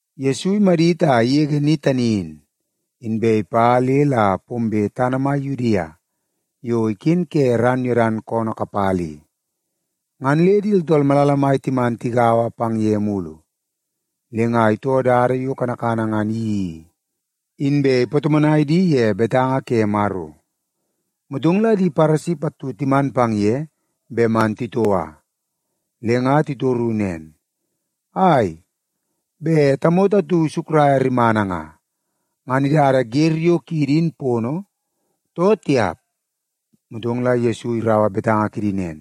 Yesu imadit a igege ni tani in, inbe ipa le la pombe tana mai Yudia yo iken ke ran Yodan koonoo kapala i. Ngan le di tooltool malala mai timan tigaua pang ye mulu. Le nga itoo dada yo kanakana ngan iyeii i, inbe ipatomonai di ye betanga ke Maro. Motong la di Paresi pattu timan pang ye bet man titoua. Le nga titoru nen, “Ai, bet tamoto atu isukraia rimana nga, ngan idada wer yo kiidi in pono, too tiap?” Motong la Yesu iraua betanga kidi nen,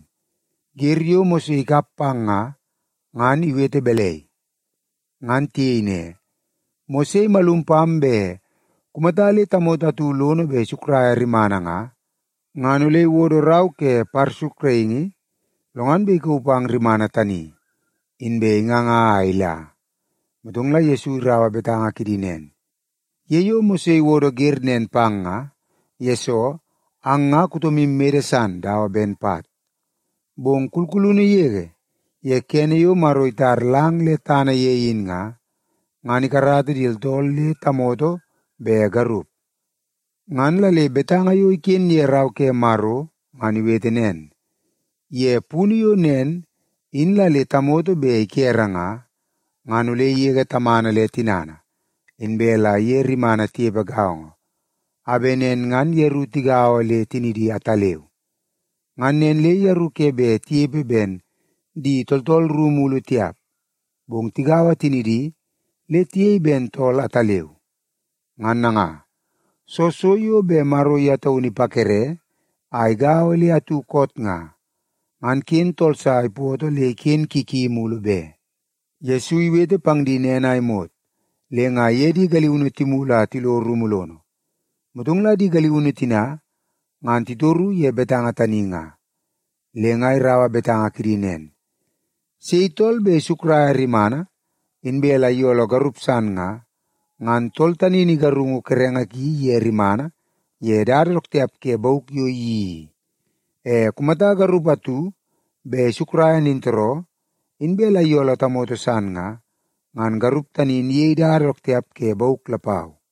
“Wer yo Mose ikap pang nga, ngan iwete balai?” Ngan tiyei ne, “Mose imalum pam bet kumata le tamoto atu lono bet isukraia rimana nga, ngan ole iwodo rau ke parsukraingi, lo ngan bet ikauu pang rimana tani, inbe inganga a ila.” Motong la Yesu iraua betanga kidi nen, “Ye yo Mose iwodo wer nen pang nga, yesoo ang nga kutomu mede san dawa ben pat. Bong kulkulunu yege, ye kene yo Maro itar lang le tana ye in nga, ngan ‘ikarata di tooltool le tamoto be garup.’ Ngan la le betanga yo iken ye Rau ke Maro ngan iwete nen, ‘Ye punu yo nen in la le tamoto bet ikere nga, ngan ole igege tamana le tinana, inbe la iye rimana tinepe gaongo, a bet nen ngan yeru tigaua le tinidi ataleu.’ Ngan nen le yeru ke bet tinepe ben di tooltool ru mulu tiap, bong tigaua tinidi le tiyei ben tool ataleu. Ngan nanga, soo so yo bet Maro ye taunu ipakere a igaua le atu koot nga, ngan ken tool sa ipoto le iken ki ki mulu be.” Yesu iwete pang di nen a imot, le nga iye di galiunu timulu a tilo rumu lono. Motong la di galiunu tina ngan titoru ye betanga tani nga. Le nga iraua betanga kidi nen, “Sei tool bet isukraia rimana, inbe la iyooloo garup san nga, ngan tool tani in igarungu kerenge ki iye rimana ye dada dook tiap ke bauk yo iyeii i. E kumata garup atu bet isukraia nintooroo, inbe la iyooloo tamoto san nga, ngan garup tani in iyei dada dook tiap ke bauk lapau.”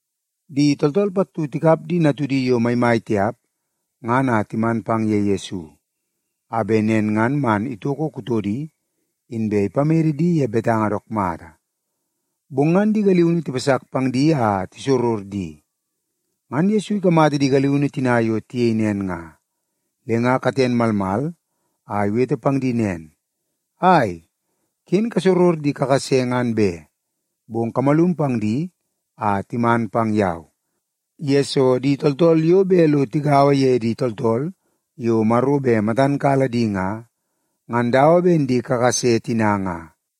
Di tooltool pattu tikap di natudi yo maimai tiap ngan a timan pang ye Yesu, a bet nen ngan man itoko kutodi inbe ipamede di ye betanga dook mata. Bong ngan di galiunu tipasak pang di a tisoror di. Ngan Yesu ikamata di galiunu tina yo tiyei nen nga, le nga katen malmal a iwete pang di nen, “Ai, ken kasoror di kakase ngan be! Bong kamalum pang di a timan pang yau, yesoo di tooltool yo bet lo tigaua ye di tooltool yo Maro bet matan kala di nga, ngan dawa ben di kakase tina nga.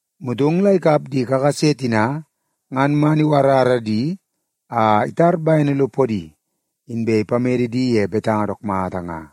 Motong la ikap di kakase tina ngan man iwarara di a itar bene lo podi, inbe ipamede di ye betanga dook mata nga.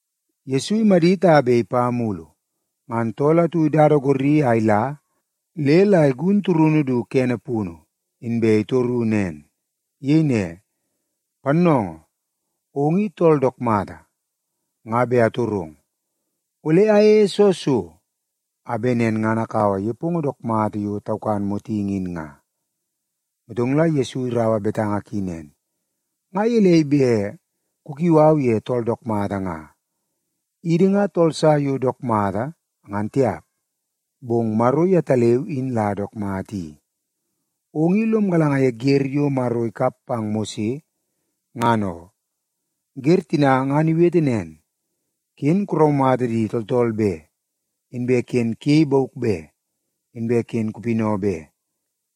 Yesu imadit a bet ipa mulu, ngan tool atu idada gorri a ila le la igun turunu du kene punu, inbe itoro nen. Iyei ne, “Pannoongoo, ong i tool dook mata. Nga bet atorong, ole ayeie soo so, a bet nen ngan akaua nepongo dook mata yo taukan motingi in nga?” Motong la Yesu iraua betanga ki nen, “Nga gelei bet kukiu au ye tool dook mata nga? Idi nga tool sa yo dook mata, ngan tiap, bong Maro yetaleu in la dook mata i. Ong i lom galanga ye wer yo Maro ikap pang Mose ngan oo. Wer tina ngan iwete nen: ‘Ken kuraumata di tooltool be, inbe ken kuyei bauk be, inbe ken kupinau be,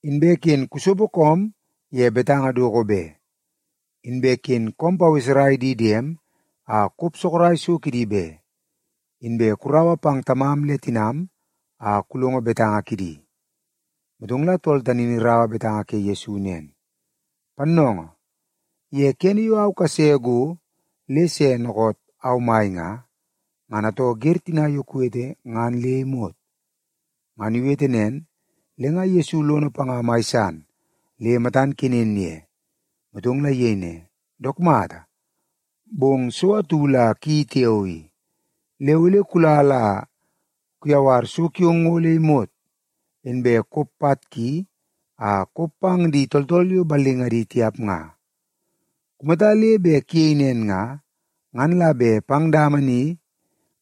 inbe ken kusopo koom ye betanga doko be, inbe ken koom paweserai di diem a kop sorok so kidi be, inbe kuraua pang tamam le tinam a kulongo betanga kidi.’” Motong la tool tani in iraua betanga ke Yesu nen, “Pannoongoo, ye kene yo au kase go le se dookoot au mai nga, ngan atoo wer tina yo kuwete ngan le imot.” Ngan iwete nen, le nga Yesu lono panga mai san le matan kenen ye. Motong la iyei ne, “Dook mata, bong so atu la kuyeii tiao i. Le ole kula la kuyawar so kiong ngo le imot, inbe kop pat ki a kop pang di tooltool yo ballingadi tiap nga. Kumata le bet kuyei nen nga, ngan la bet pang dama ni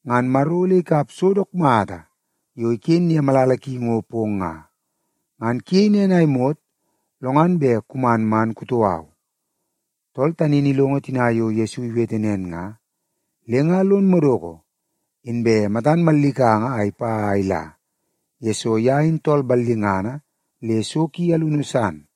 ngan Maro ole ikap so dook mata yo iken ye malala ki ngo pong nga. Ngan kuyei nen a imot, lo ngan bet kuman man kutoo au.” Tool tani in ilongo tina yo Yesu iwete nen nga, le nga lon madoko, inbe matan mallikanga a ipa a ila, yesoo ye in tool ballingana le so ki alunu san.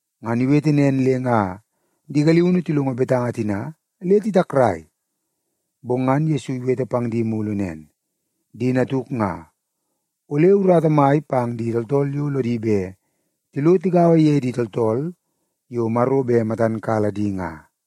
Ngan iwete nen le nga di galiunu tilongo betanga tina le titakrai. Bong ngan Yesu iwete pang di mulu nen, “Di natuk nga, ole urata mai pang di tooltool yo lodi bet tilo tigaua ye di tooltool yo Maro bet matan kala di nga.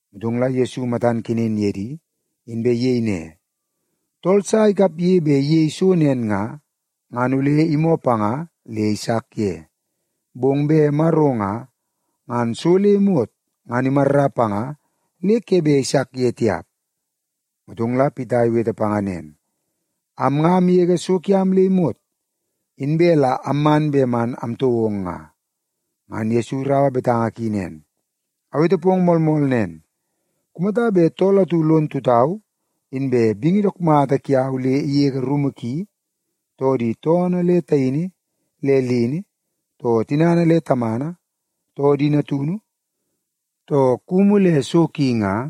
Motong la Yesu matan kenen ye di, inbe iyei ne, “Tool sa ikapge bet iyei so nen nga, ngan ole imoo panga le isak ye. Bong bet Maro nga, ngan so le imot ngan imarra panga le ke bet isak ye tiap.” Motong la Pita iwete panga nen, “Am nga amgege so kiam le imot, inbe la amman bet man amtoo ong nga.” Ngan Yesu iraua betanga ki nen, “Awete pong moolmool nen. Kumata bet tool atu lon tutau inbe bingi dook mata kiau le igege rumu ki, too di toonoo le taini le lini, too tinana le tamana, too di natunu, too kumu le so ki nga,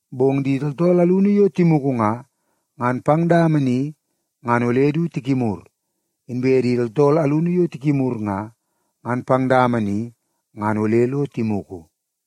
Bong di tooltool alunu yo timugu nga, ngan pang dama ni ngan ole du tikimur. Inbe di tooltool alunu yo tikimur nga, ngan pang dama ni ngan ole lo timugu.”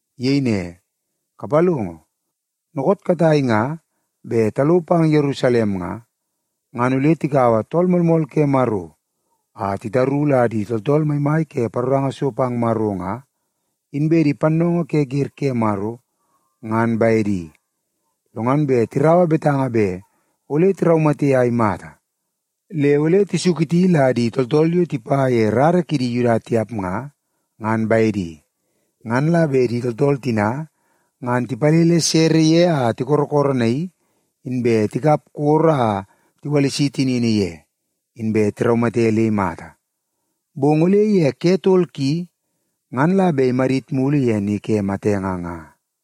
Iyei ne, “Kapalongo, dookoot katai nga bet talo pang Yerusalem nga, ngan ole tikaua Tool Moolmool ke Maro a titaru la di tooltool maimai ke paroranga so pang Maro nga, inbe di pannoongoo ke wer ke Maro, ngan bedi. Lo ngan bet tiraua betanga bet ole tiraumate a imata. Le ole tisuketi la di tooltool yo tipa ye di rara kidi Yuda tiap nga, ngan bedi. Ngan la bet di tooltool tina ngan tipalele sere ye a tikorokoronaii, inbe tikap koro a tiwalisi tinini ye, inbe tiraumate le imata. Bong ole ye ke tol ki, ngan la bet imadit mulu ye ni ke matenge nga.”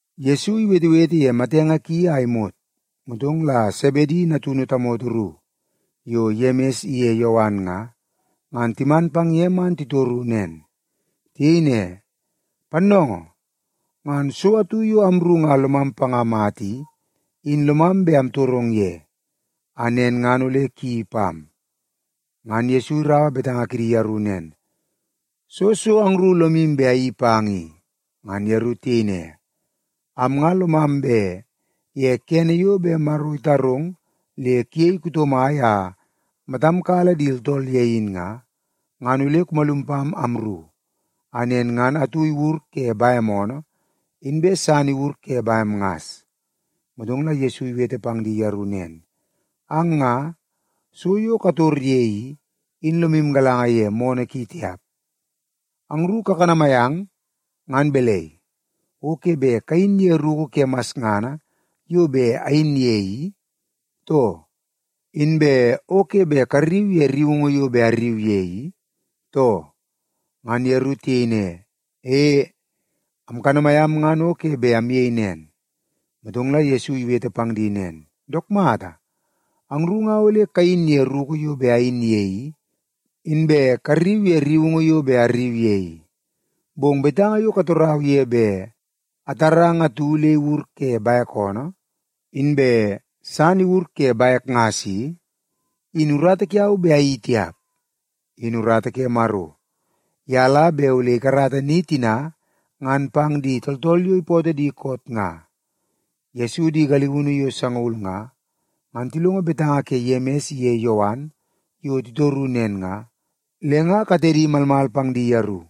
Yesu iwetewete ye matenge ki a imot, motong la Sebedi natunu tamoto ru yo Yemis iye Yowan nga, ngan timan pang ye man titoru nen. Tiyei ne, “Pannoongoo, ngan so atu yo amru nga lomam panga mata i, in lomam bet amtorong ye, a nen ngan ole kuyeii pam.” Ngan Yesu iraua betanga kidi yeru nen, “Soo so angru lomu bet ayeii pang i?” Ngan yeru tiyei ne, “Am nga lomam bet ye kene yo bet Maro itarong le kuyei kuto mai a matam kala di tooltool ye in nga, ngan ole kumalum pam amru, a nen ngan atu iwur ke bem oonoo, inbe san iwur ke bem ngas.” Motong la Yesu iwete pang di yeru nen, “Ang nga, so yo kator ye i, in lomu galanga ye moonoo ki tiap. Angru kakanamai ang ngan balai, o ke bet kayin ye ruku ke masngana yo bet ayin ye i, too? Inbe o ke bet karriu ye rriungu yo bet arriu ye i, too?” Ngan yeru tiyei ne, “E, amkanamai am ngan o ke bet amyei nen.” Motong la Yesu iwete pang di nen, “Dook mata, angru nga ole kayin ye ruku yo bet ayin ye i, inbe karriu ye rriungu yo bet arriu ye i. Bong betanga yo katorau ye bet atarang atu le iwur ke bek oonoo, inbe san iwur ke bek ngas i, in urata kiau bet ayeii tiap. In urata ke Maro, ye la bet ole ikarata ni tina ngan pang di tooltool yo ipootoo di koot nga.” Yesu di galiunu yo sangaul nga, ngan tilongo betanga ke Yemis iye Yowan yo titoru nen nga, le nga katedi malmal pang di yeru.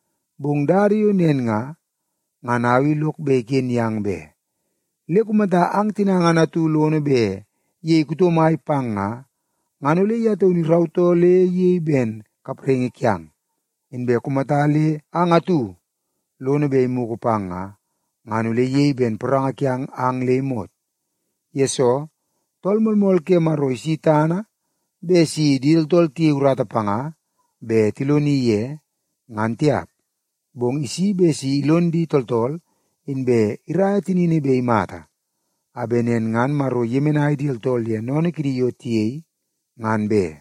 Bong dada yo nen nga, ngan au i lok bet iken yang be. Le kumata ang tina ngan atu lono bet iyei kuto mai pang nga, ngan ole ye taunu irautoo le iyei ben kapraingi kiang. Inbe kumata le ang atu lono bet imugu pang nga, ngan ole iyei ben poranga kiang ang le imot. Yesoo, Tool Moolmool ke Maro isi tana bet si di tooltool tiyei urata panga bet tiloni ye, ngan tiap. Bong isi bet si ilon di tooltool inbe iraia tinini bet imata, a bet nen ngan Maro iyemenai di tooltool ye sennene kidi yo tiyei, ngan be.”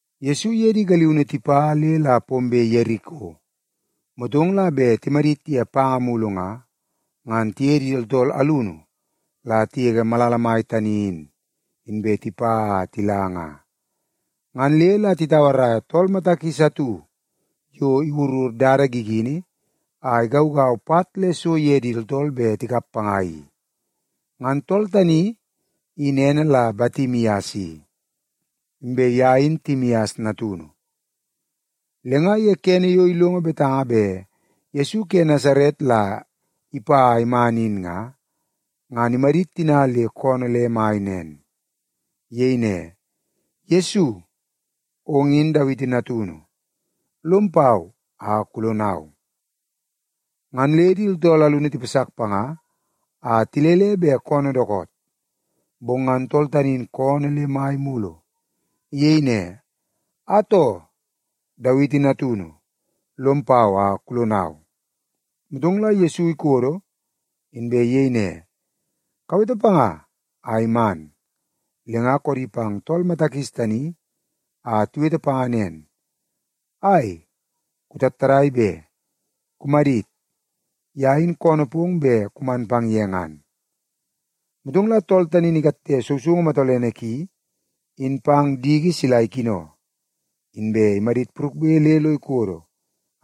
Yesu iye di galiunu tipa le la pombe Yeriko, motong la bet timadit ye panga mulu nga, ngan tiye di tooltool alunu la tigege malala mai tani in, inbe tipa a tila nga. Ngan le la titauaraia tool mata kis atu yo iwurur dada gigini a igaugau pat le so ye di tooltool bet tikap panga i. Ngan tool tani in ene la Batimias i, inbe ye in Timias natunu. Le nga ye kene yo ilongo betanga bet Yesu ke Nasaret la ipa a iman in nga, ngan imadit tina le koonoo le mai nen. Iyei ne, “Yesu, ong in Dawiti natunu. Lom pau a kulonau!” Ngan le di tooltool alunu tipasak panga a tilele bet koonoo dookoot. Bong ngan tool tani in koonoo le mai mulu. Iyei ne, “Atoo, Dawiti Natunu, lom pau a kulonau!” Motong la Yesu ikodo, inbe iyei ne, “Kawete panga a iman.” Le nga koodi pang tool mata kis tani a tiwete panga nen, “Ai, kutattadai be! Kumadit. Ye in koonoo pong bet kuman pang ye ngan.” Motong la tool tani in ikatte sousoungu matolene ki in pang diki sila ikino, inbe imadit purukbe le lo ikodo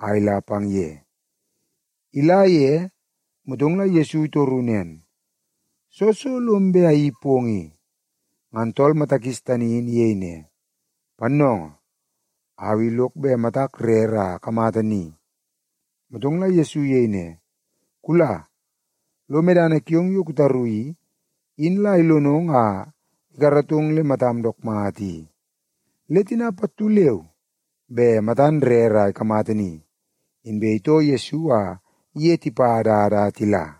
a ila pang ye. Ila ye, motong la Yesu itoru nen, “Soo so lom bet ayeii pong i?” Ngan tool mata kis tani in iyei ne, “Pannoongoo, au i lok bet matak rere a akamata ni.” Motong la Yesu iyei ne, “Kula, lo medana kiong yo kutaru i, in la ilonong a ikaratong le matam dook mata i.” Le tina pattu leu be matan rere a ikamata ni, inbe itoo Yesu a iye tipa dada a tila.